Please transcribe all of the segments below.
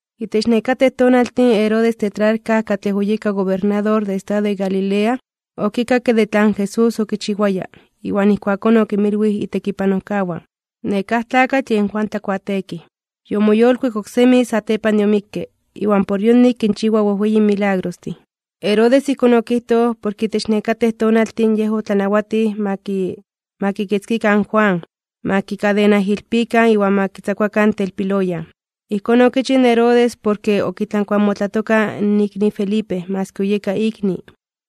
Itech nekatej tonaltin Herodes in tetrarca katlej oyeka gobernador de estado de Galilea, okikakke de tlan Jesús okichiwaya, iwan ijkuakón okinmilwij itekipanojkawan: ―Nekáj tlakatl yen Juan Tlakuateekij. Yomoyolkuik oksemi satepan de omikke, iwan por yonik kinchiwa wejweyin milagrostin. Herodes ijkón okijtoj, porke itech nekatej tonaltin yej otlanawatij ma kikitzkikan in Juan, ma kikadenaijilpikan iwan ma kitzakuakan telpiloyan. Ijkón okichij in Herodes porke okitlankuamotlatoka in Felipe maski oyeka ikni.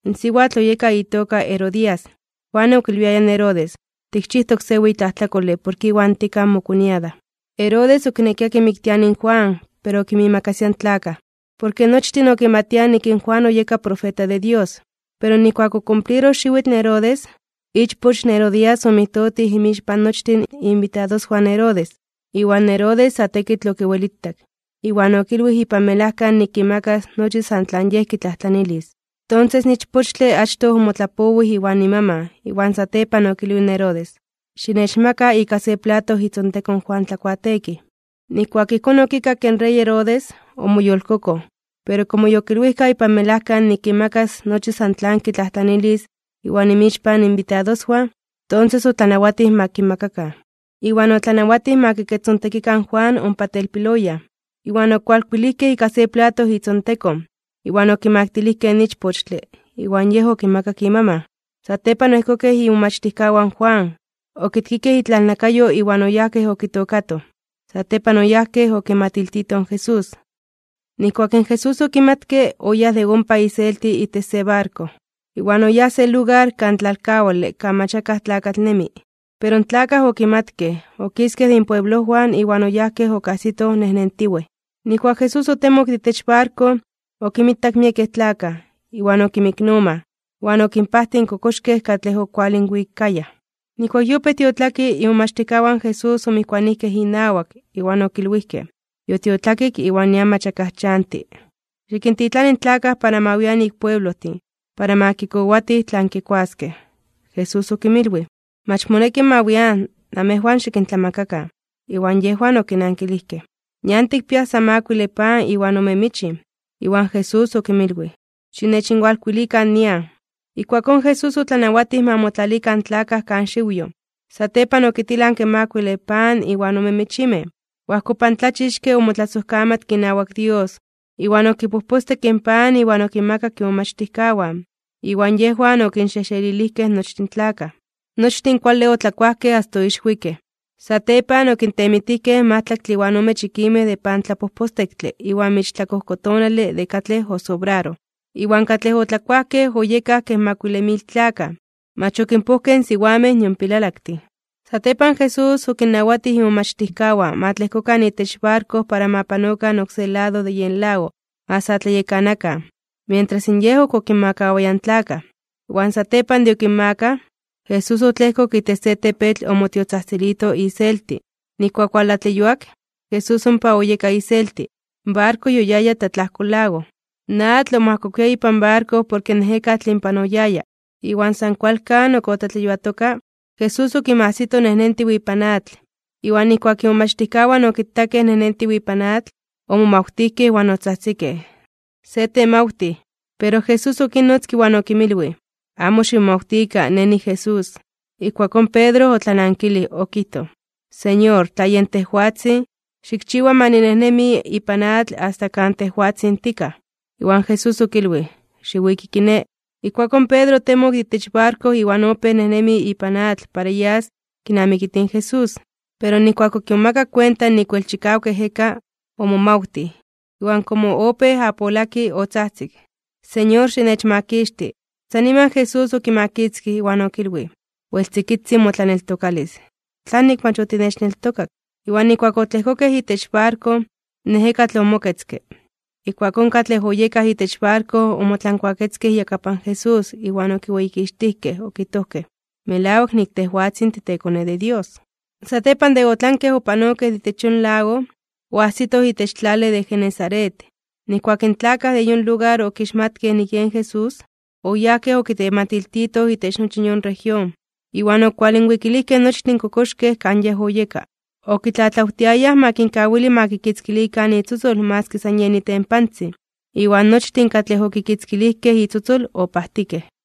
In siwatl oyeka itoka Herodías. Juan okilwiaya in Herodes: ―Tikchijtok se weyi tlajtlakole porke iwan tikaj mokoñada. Herodes okinekia kimiktiani in Juan, pero okinmiimakasia in tlakaj. Porke nochtin okimatiaj nik in Juan oyeka profeta de Dios. Pero nijkuak okumpliroj xiwitl in Herodes, ichpoch in Herodías omijtotij inmixpan nochtin iinbitadoswan in Herodes, iwan Herodes sa tekitl okiwelitak. Iwan okilwij ipan melajka nik kimakas nochi san tlan yej kitlajtlanilis. Tonses in ichpochtle achtoj omotlapowij iwan imaman, iwan satepan okilwij in Herodes: ―Xinechmaka ika se plato itzontekon in Juan Tlakuateekij. Nijkuak ijkón okikakke in rey Herodes, omoyolkokoj, pero komo yokilwijka ipan melajka nik kimakas nochi san tlan kitlajtlanilis iwan inmixpan iinbitadoswan, tonses otlanawatij ma kimakakan. Iwan otlanawatij ma kikechtzontekikan in Juan ompa telpiloyan. Iwan okualkuikej ika se plato itzontekon, iwan okimaktilijkej in ichpochtle, iwan yej okimakak imaman. Satepan oejkokej imomachtijkawan in Juan, okitkikej itlalnakayo iwan oyajkej okitookatoj. Satepan oyajkej okimatiltitoj in Jesús. Nijkuak in Jesús okimatke, oyáj de ompa iselti itech se barko, iwan oyáj se lugar kan tlalkawale kan mach akaj tlakatl nemi. Pero in tlakaj okimatkej, okiskej de inpueblojwan iwan oyajkej okajsitoj nejnentiwej. Nijkuak Jesús otemok de itech barko, okinmitak miekej tlakaj, iwan okinmiknomaj, iwan okinpajtij in kokoxkej katlej okualinwikayaj. Nijkuak yopéj tiotlaki, imomachtijkawan in Jesús omijkuanijkej inawak, iwan okilwijkej: ―Yotiotlakik, iwan nian mach akaj chanti. Xikintitlani in tlakaj para ma wian ik pueblojtin, para ma kikowatij tlan kikuaskej. Jesús okinmilwij: ―Mach moneki ma wian. Namejwan xikintlamakakan. Iwan yejwan okinankilijkej: ―Nian tikpiaj san makuile pan iwan ome michin. Iwan Jesús okinmilwij: ―Xinechinwalkuilikan nian. Ijkuakón Jesús otlanawatij ma motlalikan in tlakaj kan xiwyoj. Satepan okitilanke in makuile pan iwan ome michimej, oajkopantlachixke omotlasojkamatke inawak Dios, iwan okipojpostekke in pan iwan okinmakak imomachtijkawan, iwan yejwan okinxejxelilijkej nochtin in tlakaj. Nochtin kuale otlakuajkej asta oixwikej. Satepan okintemitijkej majtlaktle iwan ome chikimej de pantlapojpostektle iwan michintlakojkotonale de katlej osobraroj. Iwan katlej otlakuajkej oyekaj kej makuile mil tlakaj, mach okinpojkej in siwamej nion pilalaktin. Satepan Jesús okinnawatij imomachtijkawan ma tlejkokan itech barko para ma panokan oksé lado de yen lago ma sa tlayekanakan, mientras in Yej ok okinmakawaya in tlakaj. Iwan satepan de okinmakaj, Jesús otlejkok itech se tepetl omotiotzajtzilito iselti. Nijkuak owaltlatleyuak, Jesús ompa oyeka iselti. In barko yoyaya tlatlajko lago. In atl omajkokuia ipan barko porke in ejekatl inpan oyaya. Iwan san kualkan ok otlatleyuatoka, Jesús okinmajsito nejnentiw ipan atl. Iwan nijkuak imomachtijkawan okitakej nejnentiw ipan atl, omomawtijkej iwan otzajtzikej: ―¡Se temawtij! Pero Jesús okinnotzke, iwan okinmilwij: ―Amo ximomawtikan, Nej niJesús. Ijkuakón Pedro otlanankilij, okijtoj: ―Señor, tla yen tejwatzin, xikchiwa ma ninejnemi ipan atl asta kan tejwatzin tikaj. Iwan Jesús okilwij: ―Xiwiki kiné. Ijkuakón Pedro otemok de itech barko iwan opéj nejnemi ipan atl para yas kinamikitij in Jesús. Pero nijkuak okimomakak kuenta nik wel chikawak ejeka, omomawtij. Iwan komo opéj apolaki, otzajtzik: ―¡Señor, xinechmakixti! San niman Jesús okimakitzkij, iwan okilwij: ―Wel tzikitzin motlaneltokalis. ¿Tlanik mach otinechneltokak? Iwan nijkuak otlejkokej itech barko, in ejekatl omoketzke. Ijkuakón katlej oyekaj itech barko omotlankuaketzkej iyakapan Jesús iwan okiweyikixtijkej, okijtojkej: ―Melawak nik tejwatzin titeKone de Dios. Satepan de otlankej opanokej de itech yon lago, oajsitoj itech tlale de Genesaret. Nijkuak in tlakaj de yon lugar okixmatkej nik yen Jesús, oyajkej okitematiltitoj itech nochi yon región, iwan okualinwikilijkej nochtin kokoxkej kan Yej oyeka. Okitlatlawtiayaj ma kinkawili ma kikitzkilikan itzotzol maski san yen itempantzin. Iwan nochtin katlej okikitzkilijkej itzotzol, opajtikej.